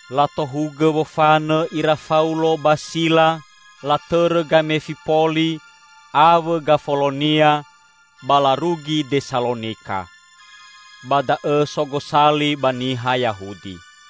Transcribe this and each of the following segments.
Latohugõ wofanõ ira Faulo ba Sila latõrõ Gamefipoli awõ Gafolonia ba larugi Desalonika. Ba da'õ so gosali ba niha Yahudi.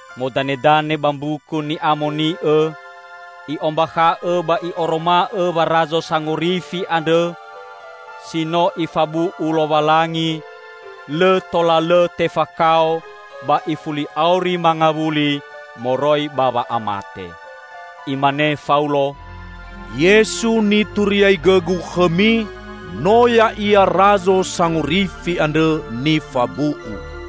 Modanedane ba Mbuku Ni'amoni'õ i'ombakha'õ ba i'oroma'õ wa Razo Sangorifi andrõ si no Ifabu'u Lowalangi lõ tola lõ tefakao ba ifuli auri mangawuli moroi ba wa'amate. Imane Faulo, "Yesu nituriaigõgu khõmi, no Ya'ia Razo Sangorifi andrõ nifabu'u."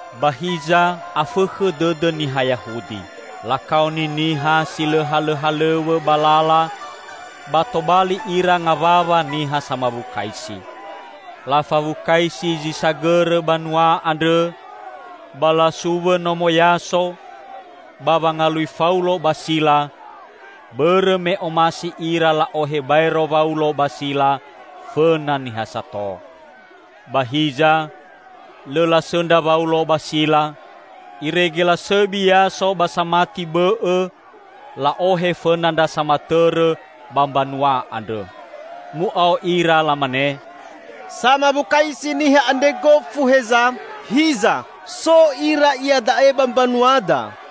Ba hiza afõkhõ dõdõ niha Yahudi. Lakaoni niha si lõ halõhalõw̃õ ba lala ba tobali ira ngawawa niha samawukaisi. Lafawukaisi zi sagõrõ banua andrõ ba lasuwõ nomo Yaso ba wangalui Faulo ba Sila, bõrõ me omasi ira la'ohe baero Waulo ba Sila fõna niha sato. Ba hiza lõ lasõndra Waulo ba Sila, irege lasõbi Yaso ba samati bõ'õ la'ohe fõna ndra samatõrõ ba mbanua andrõ. Mu'ao ira lamane, "Samawukaisi niha andre gofu heza! Hiza, so ira iada'e ba mbanuada,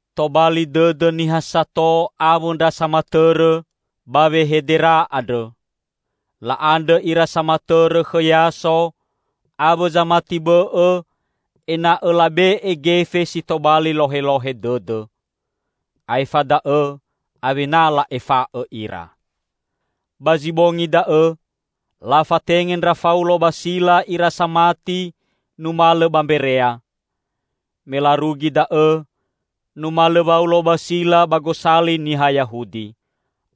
Tobali dõdõ niha sato awõ ndra samatõrõ ba wehedera andrõ. La'andrõ ira samatõrõ khõ Yaso awõ zamati bõ'õ ena'õ labe'e gefe si tobali lohelohe dõdõ. Aefa da'õ awena la'efa'õ ira. Ba zi bongi da'õ, lafatenge ndra Faulo ba Sila ira samati numalõ ba Mberea. Me larugi da'õ numalõ Waulo ba Sila ba gosali niha Yahudi.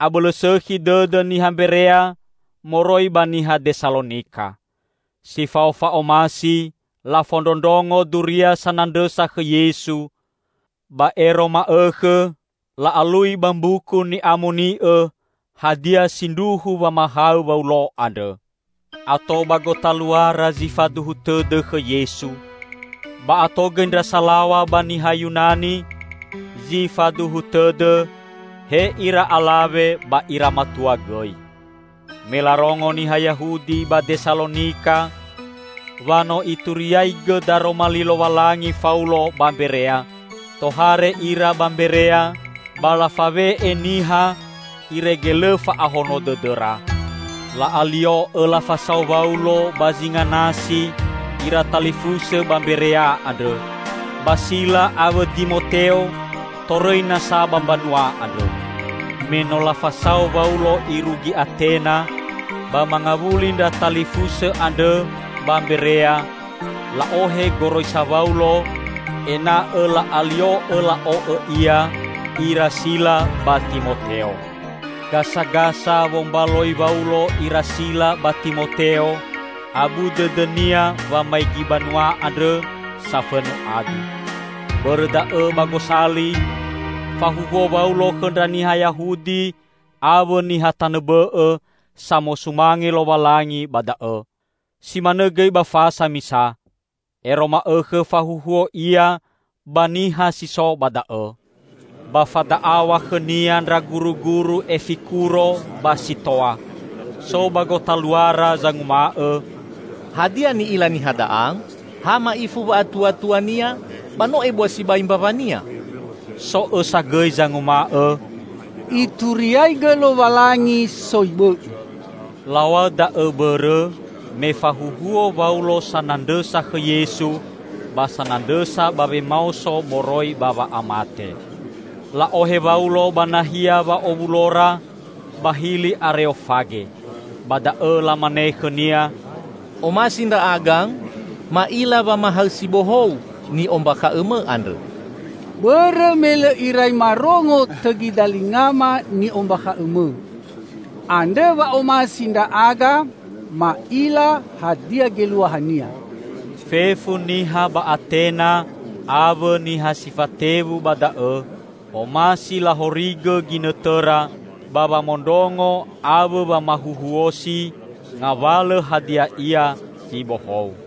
Abõlõ sõkhi dõdõ niha Mberea moroi ba niha Desalonika. Si fao fa'omasi lafondrondrongo duria sanandrõsa khõ Yesu, ba ero ma'õkhõ la'alui ba Mbuku Ni'amoni'õ hadia sindruhu wamahaõ Waulo andrõ. Ato ba gotaluara zi faduhu tõdõ khõ Yesu, ba ato gõi ndra salaw̃a ba niha Yunani, zi faduhu tõdõ; he ira alawe ba ira matua gõi. Me larongo niha Yahudi ba Desalonika wa no ituriaigõ daroma li Lowalangi Faulo ba Mberea, tohare ira ba Mberea ba lafawe'e niha irege lõ fa'ahono dõdõra. La'alio'õ lafasao Waulo ba zinga nasi ira talifusõ ba Mberea andrõ. Ba Sila awõ Dimoteo torõi nasa ba mbanua andrõ. Me no lafasao Waulo irugi Atena ba mangawuli ndra talifusõ andrõ ba Mberea la'ohe goroisa Waulo ena'õ la'alio'õ la'o'õ ia ira Sila ba Timoteo. Gasagasa wombaloi Waulo ira Sila ba Timoteo, abu dõdõnia wamaigi banua andrõ safõnu adu. Bõrõ da'õ ba gosali, fahuhuo Waulo khõ ndra niha Yahudi awõ niha tanõ bõ'õ samosumange Lowalangi ba da'õ. Si manõ gõi ba fasa misa, ero ma'õkhõ fahuhuo ia ba niha si so ba da'õ. Ba fada'aw̃a khõnia ndra guruguru Efikuro ba Sitoa. So ba gotaluara zanguma'õ, "Hadia ni'ila niha da'a? Ha ma'ifu wa'atuatuania, ba no ebua sibai mbawania!" So õsa gõi zanguma'õ, "Ituriaigõ lowalangi soi bõ'õ." Law̃aõ da'õ bõrõ, me fahuhuo Waulo sanandrõsa khõ Yesu ba sanandrõsa ba wemaoso moroi ba wa'amate. La'ohe Waulo ba nahia wa'owulora ba Hili Areofage. Ba da'õ lamane khõnia, "Omasi ndra'aga ma'ila wamahaõ si bohou ni'ombakha'õmõ andrõ. Bõrõ me lõ irai marongo tõgi dalingama ni'ombakha'õmõ. Andrõ wa omasi ndra'aga ma'ila hadia geluahania." (Fefu niha ba Atena awõ niha si fatewu ba da'õ omasi lahorigõ ginõtõra ba wamondrongo awõ wamahuhuosi ngawalõ hadia ia zi bohou.)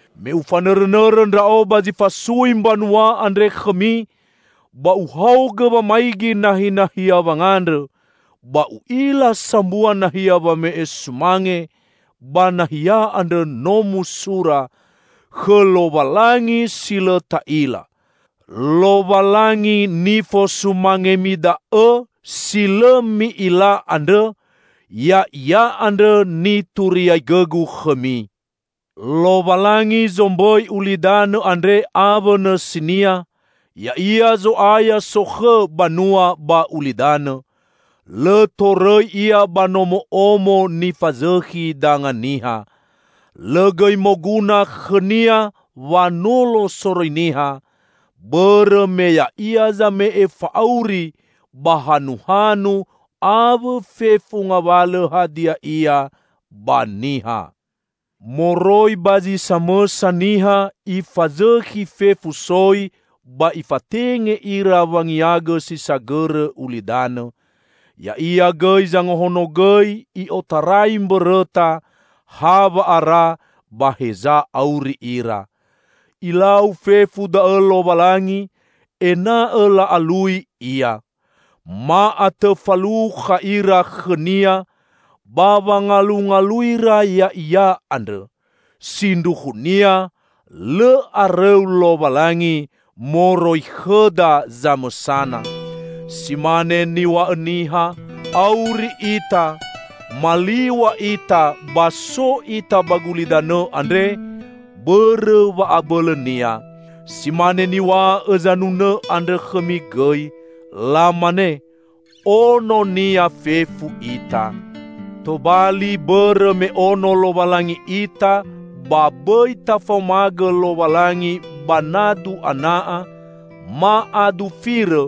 Me ufanõrõnõrõ ndra'o ba zi fasui mbanua andre khõmi ba uhaogõ wamaigi nahinahia wangandrõ, ba u'ila sambua nahia wame'e sumange; ba nahia andrõ no musura, 'Khõ Lowalangi si lõ ta'ila.' Lowalangi nifosumangemi da'õ, si lõ mi'ila andrõ, Ya'ia andrõ nituriaigõgu khõmi. Lowalangi sombõi ulidanõ andre awõ nõsinia, Ya'ia Zo'aya sokhõ banua ba ulidanõ. Lõ torõi Ia ba nomo'omo nifazõkhi danga niha. Lõ gõi moguna khõ-Nia wanolo soroi niha, bõrõ me Ya'ia zame'e fa'auri ba hanuhanu awõ fefu ngawalõ hadia ia ba niha. Moroi ba zi samõsa niha Ifazõkhi fefu soi ba Ifatenge ira wangiagõ si sagõrõ ulidanõ. Ya'ia gõi zangahonogõi i'otarai mbõrõta, hawa'ara ba heza auri ira. Ilau fefu da'õ Lowalangi ena'õ la'alui Ia. Ma'atõ falukha ira khõ-Nia ba wangalungaluira Ya'ia andrõ. Sindruhunia lõ arõu Lowalangi moroi khõda zamõsana. Si mane niw̃a'õ niha, 'Auri ita, maliw̃a ita ba so ita ba gulidanõ andre bõrõ wa'abõlõ-Nia.' Si mane niw̃a'õ zanunõ andrõ khõmi gõi. Lamane, 'Ono-Nia fefu ita.' Tobali, bõrõ me ono Lowalangi ita, ba bõi tafaomagõ Lowalangi ba nadu ana'a ma adu firõ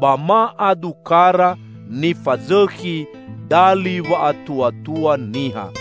ba ma adu kara nifazõkhi dali wa'atuatua niha.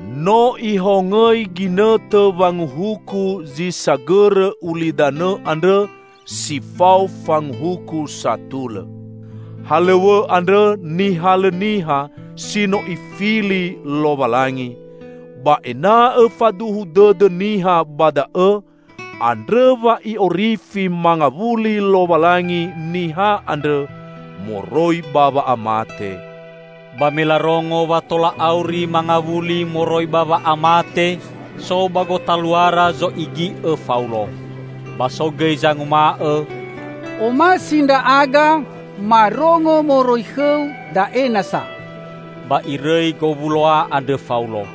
No Ihongõi ginõtõ wanguhuku zi sagõrõ ulidanõ andrõ si fao fanguhuku satulõ. Halõw̃õ andrõ nihalõ niha si no Ifili Lowalangi. Ba ena'õ faduhu dõdõ niha ba da'õ, andrõ wa I'orifi mangawuli Lowalangi niha andrõ moroi ba wa'amate!" Ba me larongo wa tola auri mangawuli moroi ba wa'amate, so ba gotaluara zo'igi'õ Faulo. Ba so gõi zanguma'õ, "Omasi ndra'aga marongo moroi khõu da'e nasa." Ba irõi gowuloa andrõ Faulo.